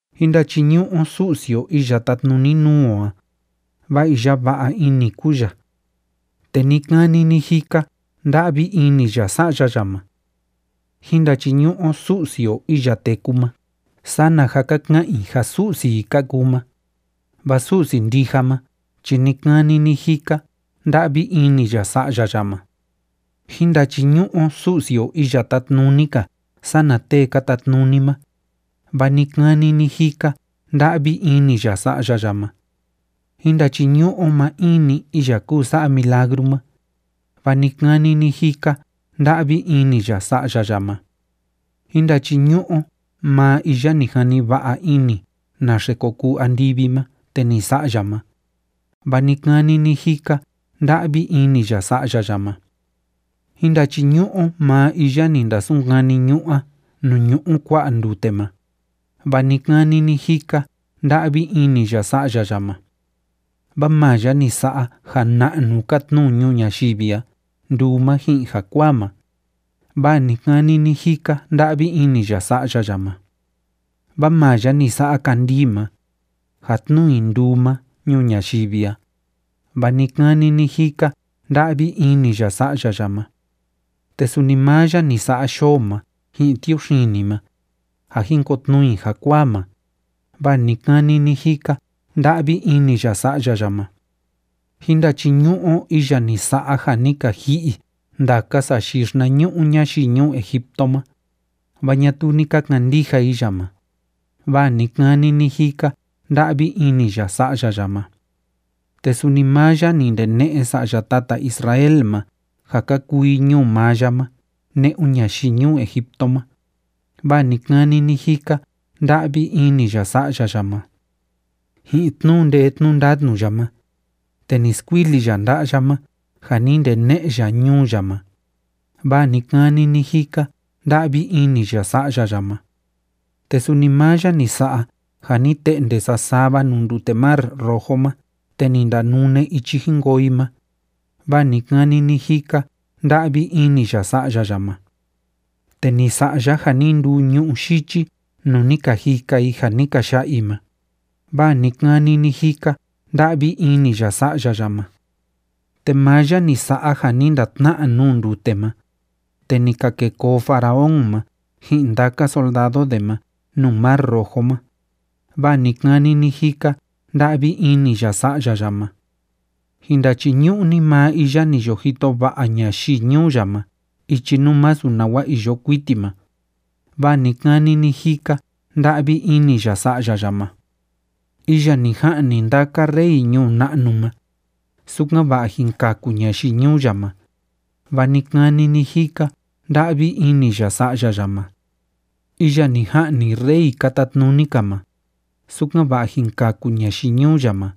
Jín ndachiñu'u o Su'si o iya tátnuni nuu o a, vaa iya va'a ini kúu ya, te ni‑kani ni‑jika nda'vi ini ya sa'ya ya ma. Jín ndachiñu'u o Su'si o iya téku ma sana ja ka ka'an i ja su'si i ka kuu ma, vaa Su'si ndija ma chi ni‑kani ni‑jika nda'vi ini ya sa'ya ya ma. Jín ndachiñu'u o Su'si o iya tátnuni‑ka sana tee ka tatnuni ma, vaa ni‑kani ni‑jika nda'vi ini ya sa'ya ya ma. Jín ndachiñu'u o maa in‑ni iya kúu sa'a milagru ma, vaa ni‑kani ni‑jika nda'vi ini ya sa'ya ya ma. Jín ndachiñu'u o maa iya ni jani va'a ini naxe ko kuu andivi ma te ni sa'a ya ma, vaa ni‑kani ni‑jika nda'vi ini ya sa'ya ya ma. Jín ndachiñu'u o maa iya ni ndasunkani ñu'ú a nuu ñu'u kua'a ndute ma, vaa ni‑kani ni‑jika nda'vi ini ya sa'ya ya ma. Vaa maa ya ni sa'a ja na'nu ka tnuu ñuu ñayivi a nduu ma ji'in jakuaa ma, vaa ni‑kani ni‑jika nda'vi ini ya sa'ya ya ma. Vaa maa ya ni sa'a kandii ma, ja tnuu i nduu ma ñuu ñayivi a, vaa ni‑kani ni‑jika nda'vi ini ya sa'ya ya ma. Te suni maa ya ni sa'a yoo ma ji'in tiuxini ma, ja jin kotnuu i jakuaa ma, vaa ni‑kani ni‑jika nda'vi ini ya sa'ya ya ma. Jín ndachiñu'u o iya ni sa'a ja ni ka ji'i ndaka sayii xinañu'u ñayii ñuu Egipto ma, vaa ñatuu ni ka kandija i ya ma, vaa ni‑kani ni‑jika nda'vi ini ya sa'ya ya ma. Te suni maa ya ni ndene'e sa'ya tata Israel ma ja ka kuu i ñuu maa ya ma ne'un ñayii ñuu Egipto ma, vaa ni‑kani ni‑jika nda'vi ini ya sa'ya ya ma. Ji'in tnu'u ndee tnu'u ndatnu ya ma, te ni skuili ya nda'a ya ma ja ni ndene'e ya ñuu ya ma, vaa ni‑kani ni‑jika nda'vi ini ya sa'ya ya ma. Te suni maa ya ni sa'a ja ni te'nde sasava nuu ndute Mar Rojo ma te ni ndanune ichi jin koo i ma, vaa ni‑kani ni‑jika nda'vi ini ya sa'ya ya ma. Te ni sa'a ya ja ni nduu ñu'ú yichi nuu ni ka jika i ja ni ka ya'a i ma, vaa ni‑kani ni‑jika nda'vi ini ya sa'ya ya ma. Te maa ya ni sa'a ja ni ndatna'a nuu ndute ma, te ni ka kêe koo Faraón ma ji'in ndaka soldado de ma nuu Mar Rojo ma, vaa ni‑kani ni‑jika nda'vi ini ya sa'ya ya ma. Jin ndachiñu'u ni maa iya ni yo jito va'a ñayii ñuu ya ma ichi nuu masu nawa iyo kuiti ma, vaa ni‑kani ni‑jika nda'vi ini ya sa'ya ya ma. Iya ni ja'ni ndaka rey ñuu na'nu ma, sukan‑va'a jin kaku ñayii ñuu ya ma, vaa ni‑kani ni‑jika nda'vi ini ya sa'ya ya ma. Iya ni ja'ni rey ka tatnuni‑ka ma, sukan‑va'a jin kaku ñayii ñuu ya ma,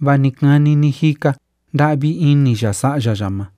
vaa ni‑kani ni‑jika nda'vi ini ya sa'ya ya ma.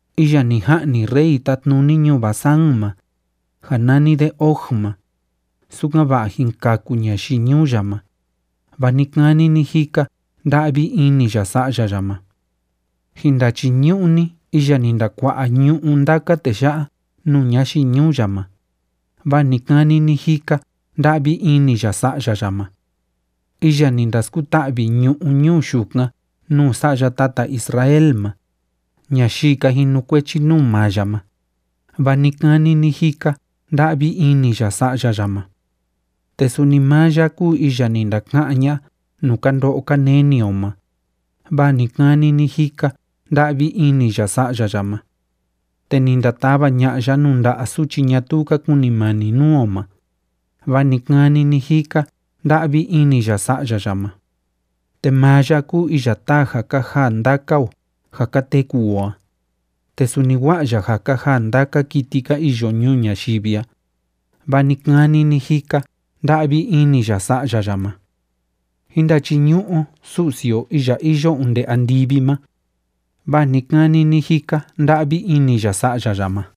Iya ni ja'ni rey tátnuni ñuu Basán ma, ja nani de Og ma, sukan‑va'a jin kaku ñayii ñuu ya ma, vaa ni‑kani ni‑jika nda'vi ini ya sa'ya ya ma. Jin ndachiñu'u ni iya ni ndakua'a ñu'ú ndaka tee ya'a nuu ñayii ñuu ya ma, vaa ni‑kani ni‑jika nda'vi ini ya sa'ya ya ma. Iya ni ndaskuta'vi ñu'ú ñuu yukan nuu sa'ya tata Israel ma, ñayii ka jinukuechi nuu maa ya ma, vaa ni‑kani ni‑jika nda'vi ini ya sa'ya ya ma. Te suni maa ya kúu iya ni ndaka'án ña'a nuu ka ndo'o ka neni o ma, vaa ni‑kani ni‑jika nda'vi ini ya sa'ya ya ma. Te ni ndatava ña'a ya nuu nda'a suchi ñatuu ka kunimani nuu o ma, vaa ni‑kani ni‑jika nda'vi ini ya sa'ya ya ma. Te maa ya kúu iya táa ja ka jaa ndaka o ja ka teku o a, te suni wa'a ya ja ka jaa ndaka kiti ka iyo ñuu ñayivi a, vaa ni‑kani ni‑jika nda'vi ini ya sa'ya ya ma. Jín ndachiñu'u o Su'si o iya iyo onde andivi ma, vaa ni‑kani ni‑jika nda'vi ini ya sa'ya ya ma.